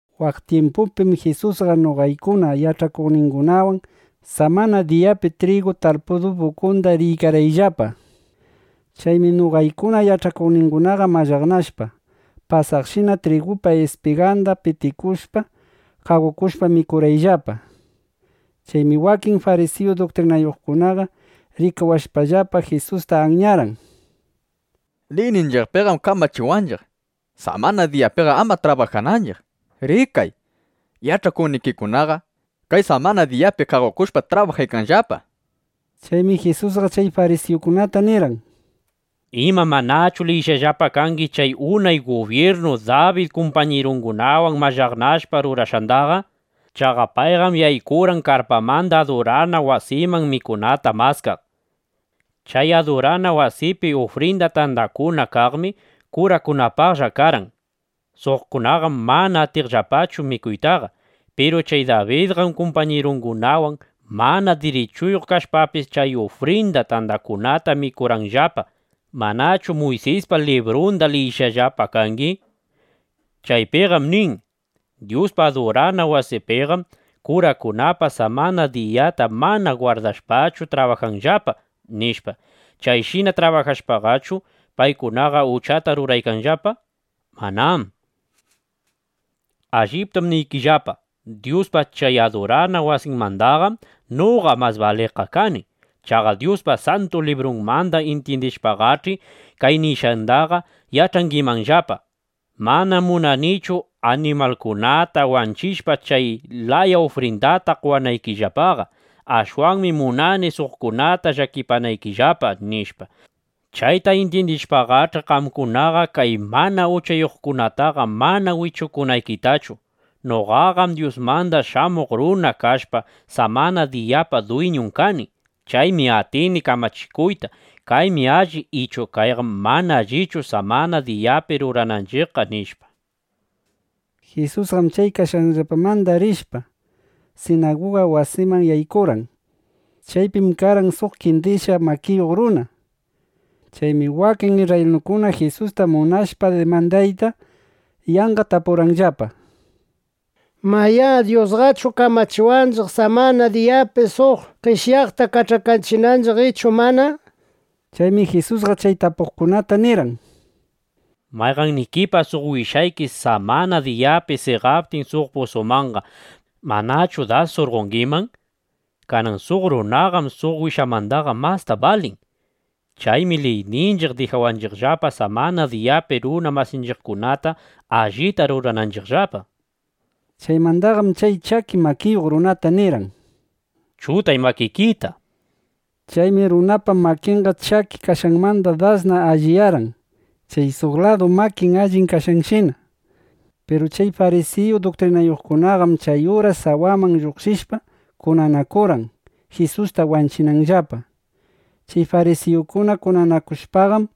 Waq tyimpupim Jisusqa noqaykuna yach'akuqningunawan samana diyapi trigu tarpudupa ukunda riykarqayllapa. Chaymi noqaykuna yach'akuqningunaqa mallaqnashpa, pasaqshina trigupa ispiganda pitikushpa, qaqokushpa mikurqayllapa. Chaymi wakin farisiyu duktrinayuqkunaqa rikawashpallapa, Jisusta anyarqan: —Liyninchiqpim kamachiwanchiq, samana diyapi ama trabajananchiq. Rikay, yach'akuqnikikunaqa kay samana diyapi qaqokushpa trabajaykanllapa, nishpa. Chaymi Jisusqa chay farisiyukunata nirqan: —¿Ima, manachu liyishqallapa kangi chay unay gubyirnu Dabid kumpañirungunawan mallaqnashpa rurashqandaqa? Chaqa payqam yaykurqan karpamanda adurana wasiman mikunata maskaq. Chay adurana wasipi ufrinda tandakuna kaqmi kurakunapaqlla karqan. Suqkunaqam mana atiqllapachu mikuytaqa. Piru chay Dabidqam kumpañirungunawan mana dirichuyuq kashpapis, chay ufrinda tandakunata mikurqanllapa. ¿Manachu Muysispa librunda liyishqallapa kangi? Chaypiqam nin: “Dyuspa adurana wasimbiqam kurakunaqa samana diyata mana gwardashpachu trabajanqallapa”, nishpa. ¿Chayshina trabajashpachu, paykunaqa uchata ruraykanllapa? Manám. Alliptam niykillapa, Dyuspa chay adurana wasinmandaqam noqa mas baliqqa kani. Chaqa Dyuspa Santu Librunmanda intyindishpaqach'i, kay nishqandaqa yach'angimanllapa: “Manam munanichu animalkunata wanchishpa, chay laya ufrindata qowanaykillapaqa. Ashwanmi munani suqkunata llakipanaykillapa”, nishpa. Chayta intyindishpaqach'i, qamkunaqa kay mana uchayuqkunataqa mana wichupanaykitachu. Noqaqam Dyusmanda Shamuq Runa kashpa, samana diyapa dwiñun kani. Chaymi atini kamachikuyta: Kaymi alli ichu kayqam mana allichu, samana diyapi rurananchiqqa, nishpa. Jisusqam chay kashqayllapamanda rishpa, sinaguga wasiman yaykurqan. Chaypim karqan suq qendishqa makiyuq runa. Chaymi wakin isrraylinukuna Jisusta munashpa dimandayta, yanqa tapurqanllapa: —Mayá, ¿Dyusqachu kamachiwanchiq samana diyapi suq qeshyaqta kach'akachinanchiq ichu mana? nishpa. Chaymi Jisusqa chay tapuqkunata nirqan: —Mayqannikipa suq wishayki samana diyapi seqaptin suq pusumanqa, ¿manachu das surqongiman? Kanan suq runaqam suq wishamandaqa masta balin. Chaymi liyninchiq dijawanchiqllapa, samana diyapi runa masinchiqkunata allita rurananchiqllapa. Chaymandaqam chay chaki makiyuq runata nirqan: —Chutay makikita, nishpa. Chaymi runapa makinqa chaki kashqanmanda das allinyarqan, chay suq ladu makin allin kaqshinana. Piru chay farisiyu duktrinayuqkunaqam chay uras sawaman lluqshishpa, kunanakurqan, Jisusta wanchinanllapa. Chay farisiyukuna kunanakuptinqam,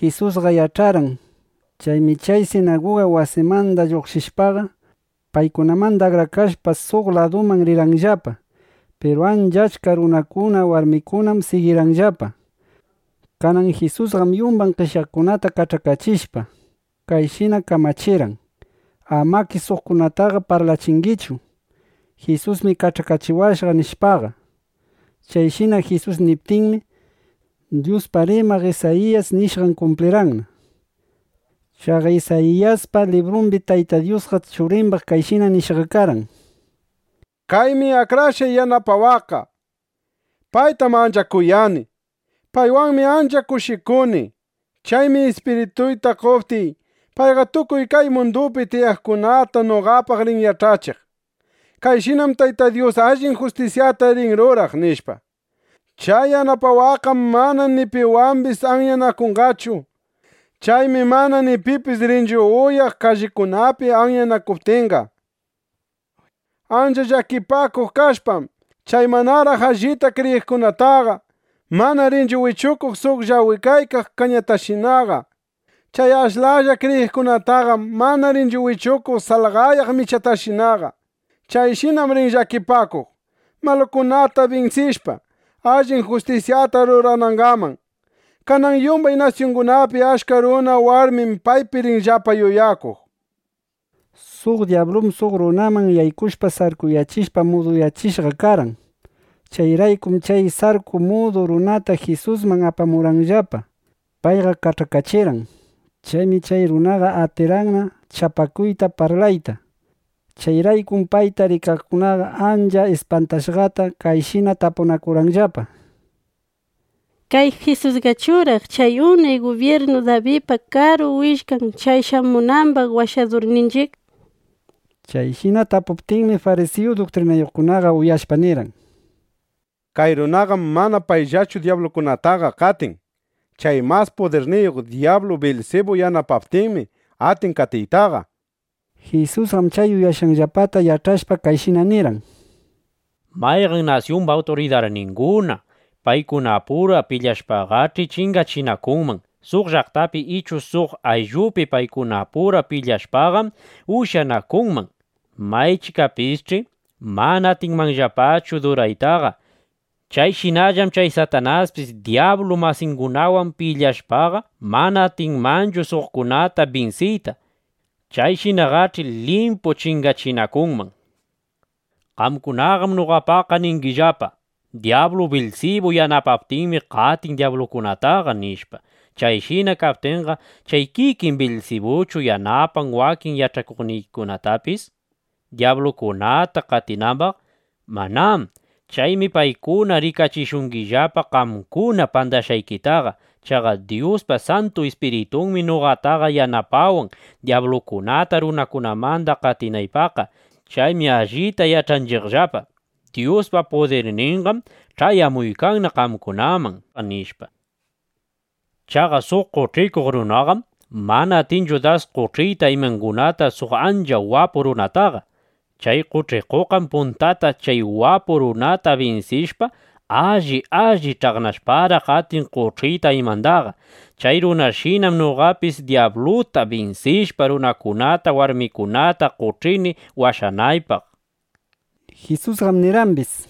Jisusqa yach'arqan. Chaymi chay sinaguga wasimanda lluqshishpaqa, paykunamanda akrakashpa, suq ladumanna rirqayllapa. Piru ancha achka runakuna, warmikunam sigirqanllapa. Kanan Jisusqam yumbay qeshyaqkunata kach'akachishpa, kayshina kamachirqan: —Amakish suqkunataqa parlachingichu: “Jisusmi kach'akachiwashqa”, nishpaqa. Chayshina Jisus niptinmi, Dyuspaq rimaq Isayiyas nishqan kumplirqan. (Chaqa Isayiyaspa librumbim Tayta Dyus Churimbaq kayshina nishqa karqan): Kaymi akrashqay yanapawaqqa. Paytam ancha kuyani. Paywanmi ancha kushikuni. Chaymi Ispirituyta qoptiy, payqa tukuy kay mundupi tiyaqkunata noqapaq rin yach'achiq: “Kayshinam Tayta Dyus allin justisyata rin ruraq”, nishpa. Chay yanapawaqqam mana ni piwambis anyanakunqachu. Chaymi mana ni pipis rinchu uyaq kallikunapi anyanakuptinqa. Ancha llakipakuq kashpam, chay manaraq allita kriyiqkunataqa mana rinchu wichukuq suq llawikaykaq kañatashinaqa. Chay ashlalla kriyiqkunataqam mana rinchu wanchiq salqayaykaq michatashinaqa. Chayshinam rin llakipakuq, malukunata binsishpa, allin justisyata ruranangaman. Kanan yumbay nasyungunapi achka runa warmim paypi rinllapa yuyakuq, nishpa. Suq dyablum suq runaman yaykushpa sarkuyachishpa, muduyachishqa karqan. Chayraykum chay sarku mudu runata Jisusman apamuptinllapa, payqa kach'akachirqan. Chaymi chay runaqa atirqanna chapakuyta, parlayta. Chayraykum payta rikaqkunaqa ancha ispantashqata kayshina tapunakurqanllapa: —¿Kay Jisusqachuraq chay unay gubyirnu Dabidpa Karu Willkan chay shamunambaq Washadurninchiq? nishpa. Chayshina tapunakuptinmi, farisiyu duktrinayuqkunaqa uyashpa nirqan: —Kay runaqam mana payllachu dyablukunataqa qatin. Chay mas pudirniyuq dyablu Bilsibu yanapaptinmi, atin qatiytaqa, nishpa. Jisusqam chay yuyashqanllapata yach'ashpa, kayshina nirqan: —Mayqan nasyumba awturidarninguna paykunapura pilyanakushpaqash', chingachinakunman. Suq llaqtapi ichu suq ayllupi paykunapura pilyashpaqam, ushyanakunman. Maychikapisch'i mana atinmanllapachu duraytaqa. Chayshinallam chay Satanaspis dyablu masingunawan pilyashpaqa, mana atinmanchu suqkunata binsiyta. Chayshinaqach'i limpu chingachinakunman. Qamkunaqam noqapaq ningillapa: “Dyablu Bilsibu yanapaptinmi, qatin dyablukunataqa”, nishpa. Chayshina kaptinqa ¿chay kikin Bilsibuchu yanapan wakin yach'akuqnikitapis, dyablukunata qatinambaqqa? ¡Manám! Chaymi paykuna rikachishungillapa qamkuna pandashqaykitaqa. Chaqa Dyuspa Santu Ispiritunmi noqataqa yanapawan, dyablukunata runakunamanda qatinaypaqqa. Chaymi allita yach'anchiqllapa: Dyuspa pudirninqam ch'ayamuykanna qamkunaman, nishpa. ’Chaqa suq qoch'ikuq runaqam mana atinchu dasqa qoch'iyta imangunata suq ancha wapu runataqa. Chay qoch'ikuqqam puntata chay wapu runata binsishpa, alli alli ch'aqnashparaq, atin qoch'iyta imandaqa. (Chay runashinam noqapis dyabluta binsishpa, runakunata, warmikunata qoch'ini washanaypaq), nishpa. Jisusqam nirqambis: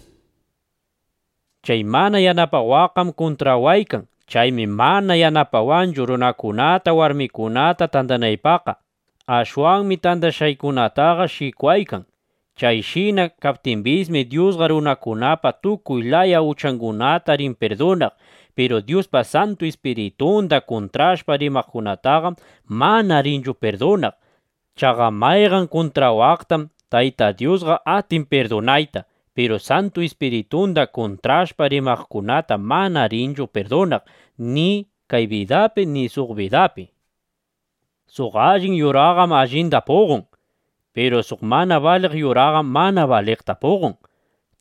—Chay mana yanapawaqqam kuntrawaykan. Chaymi mana yanapawanchu, runakunata, warmikunata tandanaypaqqa. Ashwanmi tandashqaykunataqa shikwaykan. Chayshina kaptimbismi, Dyusqa runakunapa tukuy laya uchangunata rin pirdunaq. Piru Dyuspa Santu Ispiritunda kuntrashpa rimaqkunataqam mana rinchu pirdunaq. Chaqa mayqan kuntrawaqtam Tayta Dyusqa atin pirdunayta. Piru Santu Ispiritunda kuntrashpa rimaqkunata mana rinchu pirdunaq, ni kay bidapi, ni suq bidapi. ’Suq allin yuraqam allinda puqon. Piru suq mana baliq yuraqam mana baliqta puqon.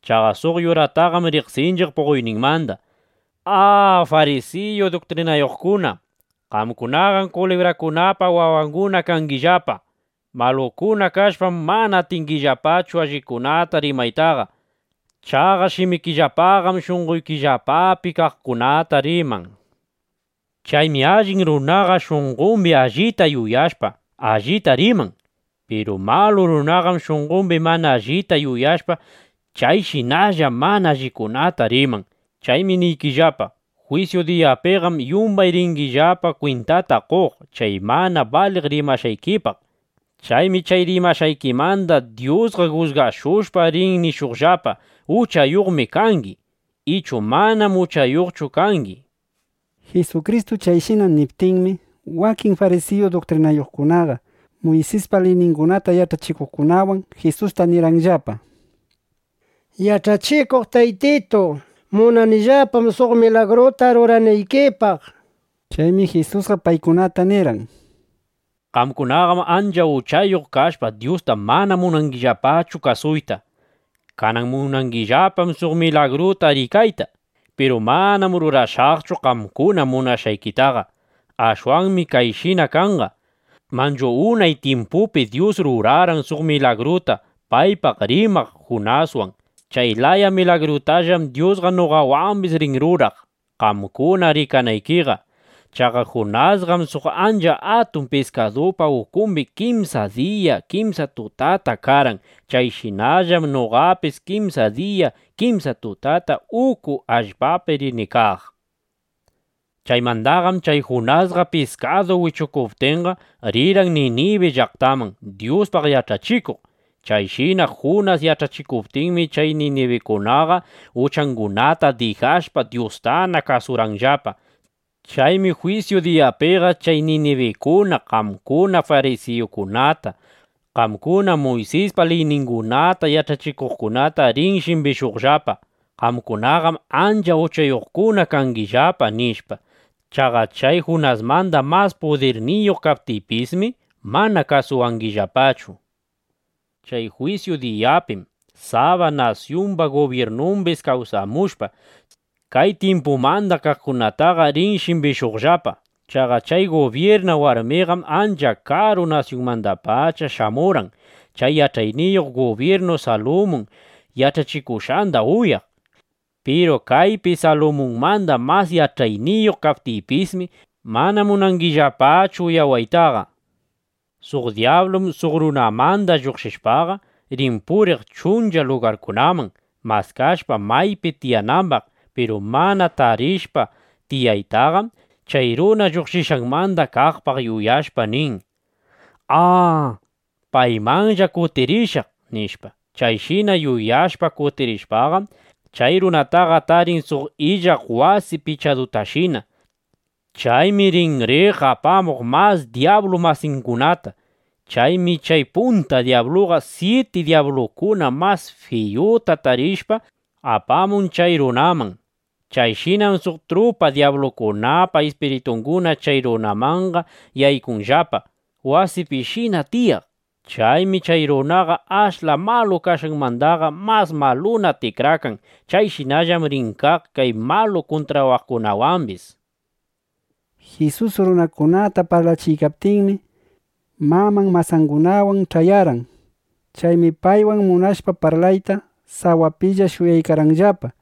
Chaqa suq yurataqam riqsinchiq puqoyninmanda. ¡A, farisiyu duktrinayuqkuna, qamkunaqam kulibrakunapa wawanguna kangillapa! ¡Malukuna kashpam, mana atingillapachu allikunata rimaytaqa! Chaqa shimikillapaqam shunqoykillapapi kaqkunata riman. Chaymi allin runaqam shunqombi allita yuyashpa, allita riman. Piru malu runaqam, shunqombi mana allita yuyashpa, chayshinalla mana allikunata riman. Chaymi niykillapa, jwisyu diyapiqam yumbay ringillapa kwintata qoq chay mana baliq rimashqaykipaq. Chaymi chay rimashqaykimanda Dyusqa jusgashushpa, rin nishuqllapa: “Uchayuqmi kangi”, ichu “Manam uchayuqchu kangi”, nishpa. Jisukristu chayshina niptinmi, wakin farisiyu duktrinayuqkunaqa Muysispa liyningunata yach'achikuqkunawan Jisusta nirqanllapa: —Yach'achikuq Taytitu, munanillapam suq milagruta ruranaykipaq, nishpa. Chaymi Jisusqa paykunata nirqan: —Qamkunaqam ancha uchayuq kashpa, Dyusta mana munangillapachu kasuyta. Kanan munangillapam suq milagruta rikayta. Piru manam rurashaqchu qamkuna munashqaykitaqa. Ashwanmi kayshina kanqa. Manchu unay tyimpupi Dyus rurarqan suq milagruta paypaq rimaq Junaswan. Chay laya milagrutallam Dyusqa noqawambis rin ruraq, qamkuna rikanaykiqa. Chaqa Junasqam suq ancha atun piskadupa ukumbi kimsa diya, kimsa tutata karqan. Chayshinallam noqapis kimsa diya, kimsa tutata uku allpapi rini kaq. (Chaymandaqam chay Junasta piskadu wichukuptinqa, rirqan Ninibi llaqtaman, Dyuspaq yach'achikuq.) Chayshina Junas yach'achikuptinmi, chay ninibinukunaqa uchangunata dijashpa, Dyustana kasurqanllapa. Chaymi jwisyu diyapiqa chay ninibinukuna qamkuna farisiyukunata, qamkuna Muysispa liyningunata yach'achikuqkunata rin shimbishuqllapa: “Qamkunaqam ancha uchayuqkuna kangillapa”, nishpa. Chaqa chay Junasmanda mas pudirniyuq kaptiypismi, mana kasuwangillapachu. Chay jwisyu diyapim Saba nasyumba gubyirnambis kawsamushpa, kay tyimpumanda kaqkunataqa rin shimbishuqllapa. Chaqa chay gubyirna warmiqam ancha karu nasyunmandapacha shamurqan, chay yach'ayniyuq gubyirnu Salumun yach'achikushqanda uyaq. Piru kaypi Salumunmanda mas yach'ayniyuq kaptiypismi, mana munangillapachu uyawaytaqa. ’Suq dyablum suq runamanda lluqshishpaqa, rin puriq chuncha lugarkunaman, maskashpa maypi tiyanambaq. Piru mana tarishpa tiyanandaqam, chay runa lluqshishqanmanda kaqpaq yuyashpa nin: “¡A, paymanlla kutirishaq!” nishpa. Chayshina yuyashpa, kutirishpaqam, chay runataqa tarin suq illaq wasi pichadutashina. Chaymi rin riq apamuq mas dyablu masingunata. Chaymi chay punta dyabluqa syiti dyablukuna mas fiyuta tarishpa, apamun chay runaman. Chayshinam suq trupa dyablukunapa ispiritunguna chay runamanqa yaykunllapa, wasipishina tiyaq. Chaymi chay runaqa ashla malu kashqanmandaqa mas maluna tikrakan. Chayshinallam rin kaq kay malu runakunawambis, nishpa. Jisus runakunata parlachiykaptinmi, maman masangunawan ch'ayarqan. Chaymi paywan munashpa parlayta, sawapilla shuyaykarqanllapa. ˻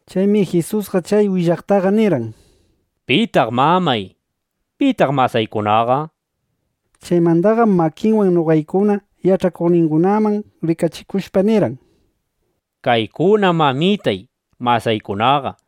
Chaymi Jisusqa chay willaqtaqa nirqan: —¿Pitaq mamay? ¿Pitaq masaykunaqa? nishpa. Chaymandaqam makinwan noqaykuna yach'akuqningunaman rikachikushpa, nirqan: —Kaykunam mamitay, masaykunaqa.